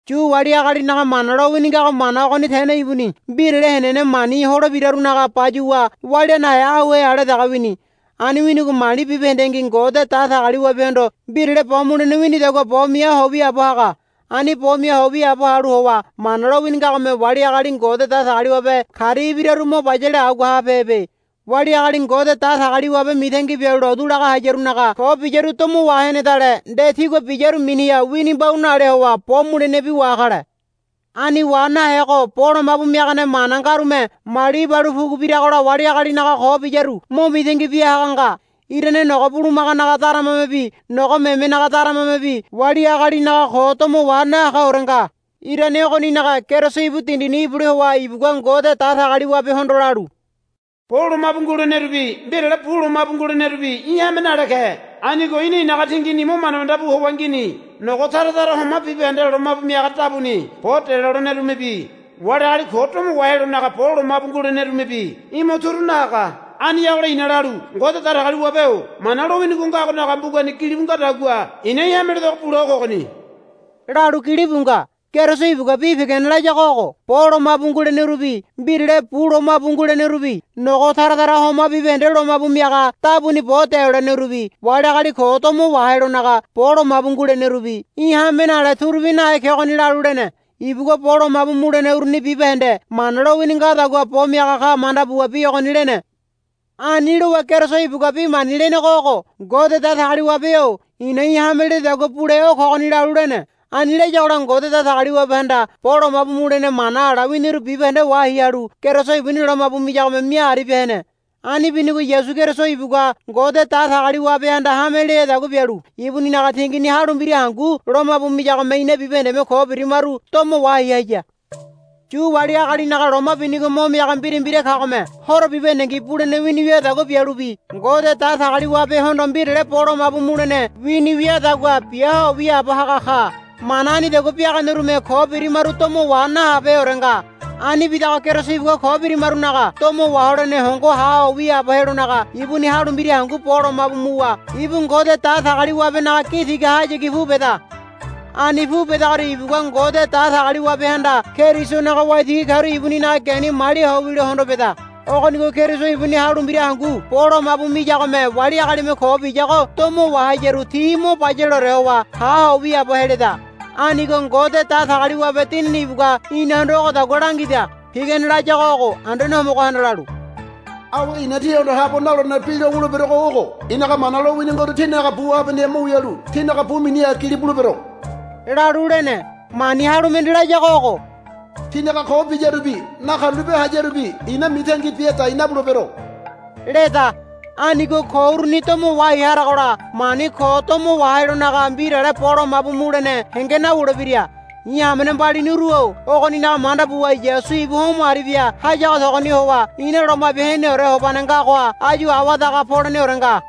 Yu wali agalinaga Mana lowini ngago mana ogoni tene ibuni mbirale henene mani holebirarunaga bayuwa walia nahe auhe ale dege wini. Ani winigo mali bibahendengi Ngode Datagaliwabehondo mbirale bo mulene winidagua bo mia ho wiaabo haga. Ani bo mia ho wiaabo halu howa Mana lowini ngagome wali agali Ngode Datagaliwabe karia ibiraru mo bayale agua habehebe. Wali agali Ngode Datagaliwabe mitangi bialu lotu laga hayarunaga ko biyaru domo wahenedale nde tigua biyaru miniha wini mbau nale howa bo mulenebi wakale. Ani wa nahego bo lomabu miagane mana ngarume mali ibalu pugu biragola wali agalinaga ko biyaru mo mitangi bia haga nga. Irane nogo bulumaganaga daramamebi nogo memenaga daramamebi wali agalinaga ko domo wa nahagaore nga. Irane ogoninaga Keriso ibu dindini ibule howa ibugua Ngode Datagaliwabehondo lalu, Bo lomabu ngulenerubi mbirale bu lomabu ngulenerubi í̠ hame nale ke. Anigo í̠na i̱naga tingini mo manda manda bu howa ngini. Nogo tara tara homa bibahende lomabu miaga dabuni bo delolenerumebi wali agali ko domo wahelonaga bo lomabu ngulenerumebi í̠ mo turu nahaga. Aniyagola i̱na lalu, Ngode Datagaliwabe-o Mana lowini ngagonaga mbugani gilibu ngadagua i̱na í̠ hame ledego bule o kogoni, lalu gilibu nga. Keriso ibugua bi pigane layago ogo, Bo lomabu ngulenerubi mbirale bu lomabu ngulenerubi nogo tara tara homa bibahende lomabu miaga dabuni bo delolenerubi wali agali ko domo wahelonaga bo lomabu ngulenerubi í̠ hame nale turubi nahe kegoni, lalu lene. Ibugua bo lomabu mulene uruni bibahende Mana lowini ngadagua bo miaga ka manda buwa bi ogoni lene. Ani lowa Keriso ibugua bi mani lenego ogo, Ngode Datagaliwabe-o i̱na í̠ hame lededagua bule o kogoni, lalu lene. Ani layagola Ngode Datagaliwabehanda bo lomabu mulene mana ala winiru bibahende wahai halu Keriso ibuni lomabu miyagome mia aribia hene. Ani binigo Yasu Keriso ibugua Ngode Datagaliwabehanda hame leadagua bialu ibuninaga tingini halu mbira hangu lomabu miyagome ina bibahendeme ko birimaru domo wahai haya. Yu wali agalinaga loma binigo mo miaga mbira mbira kagome horo bibahendengi bulene wini wiadagua bialubi Ngode Datagaliwabehondo mbirale bo lomabu mulene wini wiadagua bia ho wiaabo haga ka. Mana anidagua biaganerume ko birimaru domo wa nahabeheore nga. Ani bidago Keriso ibugua ko birimarunaga domo waholene hongo ha ho wiaabo helonaga ibuni halu mbira hangu bo lomabu muwa ibu Ngode Datagaliwabenaga gi tigahayagi pu beda. Ani pu bedagoria ibugua Ngode Datagaliwabehanda Kerisonaga waitigi karu ibuninaga geni malia ho wilo hondo beda. Ogonigo Keriso ibuni halu mbira hangu bo lomabu miyagome wali agalime ko biyago domo wahayaru ti mo bayaleore howa ha ho wiaabo heleda. Anigo Ngode Datagaliwabe Dinini ibugua inahondo ogodagua langida. Pigane layago ogo, Anduane Homogohanda lalu, Awe i̱na tihondo habo nalolene bi lo wuleberogo ogo. I̱naga mana lowini ngoru tinaga bu habaneha mo wialu tinaga bu mininibi gili bulebero, lalu lene. Mani halu mende layago ogo, Tinaga ko biyarubi nakarulape hayarubi i̱na mitangi bia dai nabulebero, leda. Anigo ko uruni domo wahai haragola mani ko domo wahelonaga mbirale bo lomabu mulene henge nawulebira. I̱ hamene mbaliniru-o ogoninaga manda buwa Yasu ibu homo aribia hayago togoni howa ina Loma Bia Heneore Hobane ngagoha áyu awadaga poleneore nga.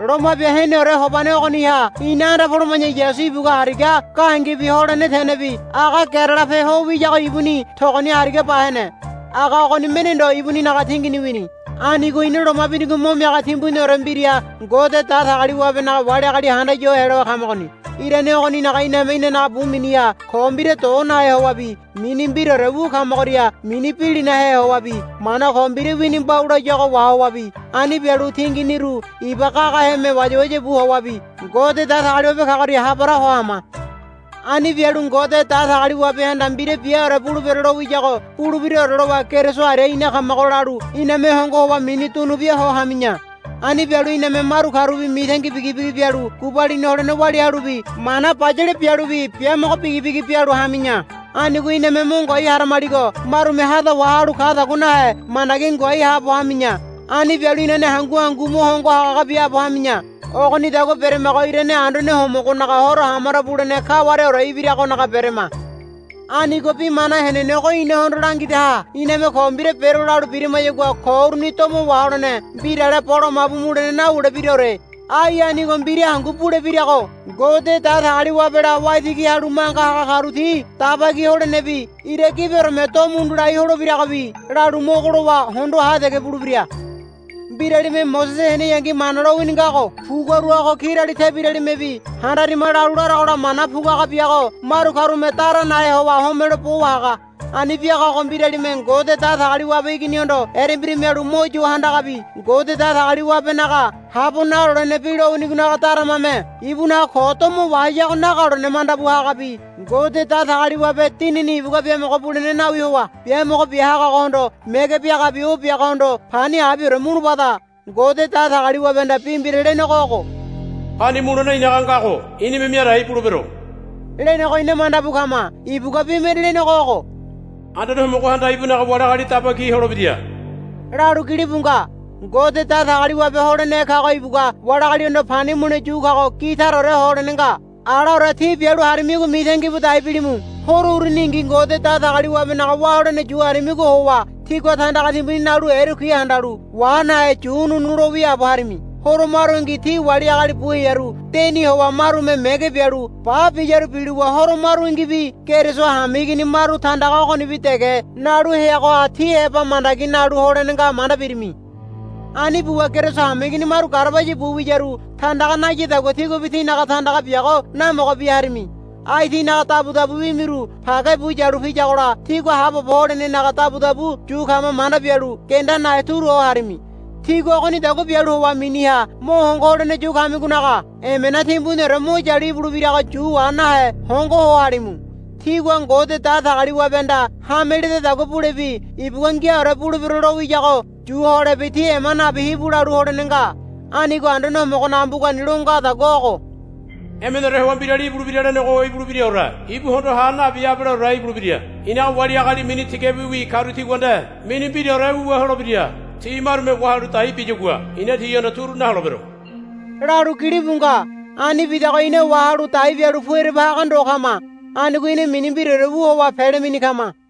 Loma Bia Heneore Hobane ogoniha ina anda poloma̱ya Yasu ibugua hariga gahengebi holene tenebi aga gerelape ho wiyago ibuni togoni hariga ba hene. Aga ogoni mende ndo ibuninaga tingini wini. Anigo ina loma binigo mo miaga timbuniore mbira Ngode Datagaliwabenaga wali agali handaya ho helowa kamagoni. Irane ogoninaga iname inanaga bu miniha ko mbira do nahe howabi mini mbiraore wu kamagoria mini bilinahe howabi mana ko mbira wini mbau layago wahowabi ani bialu tinginiru iba gagaheme wayawaya bu howabi Ngode Datagaliwabe kagoria ha para ho hama. Ani bialu Ngode Datagaliwabehanda mbira biaore bulebero lowiyago bulebiraore lowa Keriso aria ina kamago lalu iname hongo howa mini dunubia ho hami̱ya. Ani bialu iname maru karubi mitangi bigibigi bialu gubalini holene walia halubi mana bayale bialubi biamogo bigibigi bialu hami̱ya. Anigo iname mo ngoai haramaligo marume hado wahalu kadagua nahe mandagi ngoai haabo hami̱ya. Ani bialu inane hangu hangu mo hongo haga biaabo hami̱ya. Ogonidagua beramago irane Anduane Homogonaga Horo hamaro bulene kawareore ibiragonaga berama. Anigo bi mana henenego inahondo langidaha iname, Ko mbira bero, lalu birimayagua ko uruni domo waholene mbirale bo lomabu mulene nawulebiraore. Ai anigo mbira hangu bulebirago. Ngode Datagaliwabela waitigi halu manga haga karu ti Daba Ki holenebi ira gibioreme do mundu lai holebiragobi lalu mogo lowa hondo ha dege bulebira. Mbiralime Mosese heneyangi Mana lowini ngago puguarago kirali tebiralimebi handarima lalu laragola mana puguaga biago maru karume dara nahe howa homelo bo wahaga. Ani biagago mbiralime Ngode Datagaliwabe Iginihondo erembira mialu mo yo handagabi Ngode Datagaliwabenaga habo nalolene bi lowinigonaga daramame ibunaga ko domayago nagalone manda bu hagabi Ngode Datagaliwabe Dinini ibugua biamogo bulene nawi howa biamogo bia hagagohondo mege biagabi o biagohondo pani abiore mulubada. Ngode Datagaliwabehanda bi mbira lenego ogo, Pani mulene i̱naga ngago i̱nime mia dai bulebero, lenego ina manda bu kama. Ibugua bi mende lenego ogo, Anduane Homogohanda ibunaga wali agali daba ki holebira, lalu gilibu nga. Ngode Datagaliwabe holenehe kago ibugua wali agalihondo pani mule yu kago gi taraore ho holene nga. Alaore tí bialu harimigo mitangi bu dai bilimu. Horo uruningi Ngode Datagaliwabenaga wá holene yu harimigo howa tígua tandaga timbuni nalu erekui handalu wa nahe yu ununu lo wiaabo harimi. Horo marungi tí wali agali bu hearu deni howa marume mege bialu ba biyaru bilowa horo marungibi Keriso hameigini maru tandaga ogonibi dege nalu heagoha ti heba mandagi nalu holene nga manda birimi. Ani buwa Keriso hameigini maru garabaya bu wiyaru tandaga nayadagua tíguabi tinaga tandaga biago namogo bia harimi. Ai tínaga dabudabu wimiru page bu yalu piyagola tígua haabobo holenenaga dabudabu yu kama manda bialu genda nahe turu ho harimi. Tígua ogonidagua bialu howa miniha mo hongo holene yu kamigonaga emena timbuniore mo yalu ibulebirago yu wa nahe hongo ho halimu. Tígua Ngode Datagaliwabehanda hame ledadagua bulebi ibugua, Ngiaore bulebero, lowiyago yu holebi tí ema nabi hibu lalu holene nga. Anigo Anduane Homogonaga mbugani lo ngadagua ogo, Emeneore howa mbirali ibulebira lenego ibulebiraore. Ibu hondoha nabi abaleore ibulebira. I̱naga wali agali mini tigabiwi karu tigua nde mini mbiraore wuwa holebira. Ti marume wahalu dai biyagua i̱na tihondo turu naholebero, lalu gilibu nga. Ani bidago ina wahalu dai bialu pu ereba haga ndo kama. Anigo ina mini mbiraore wu howa pele mini kama.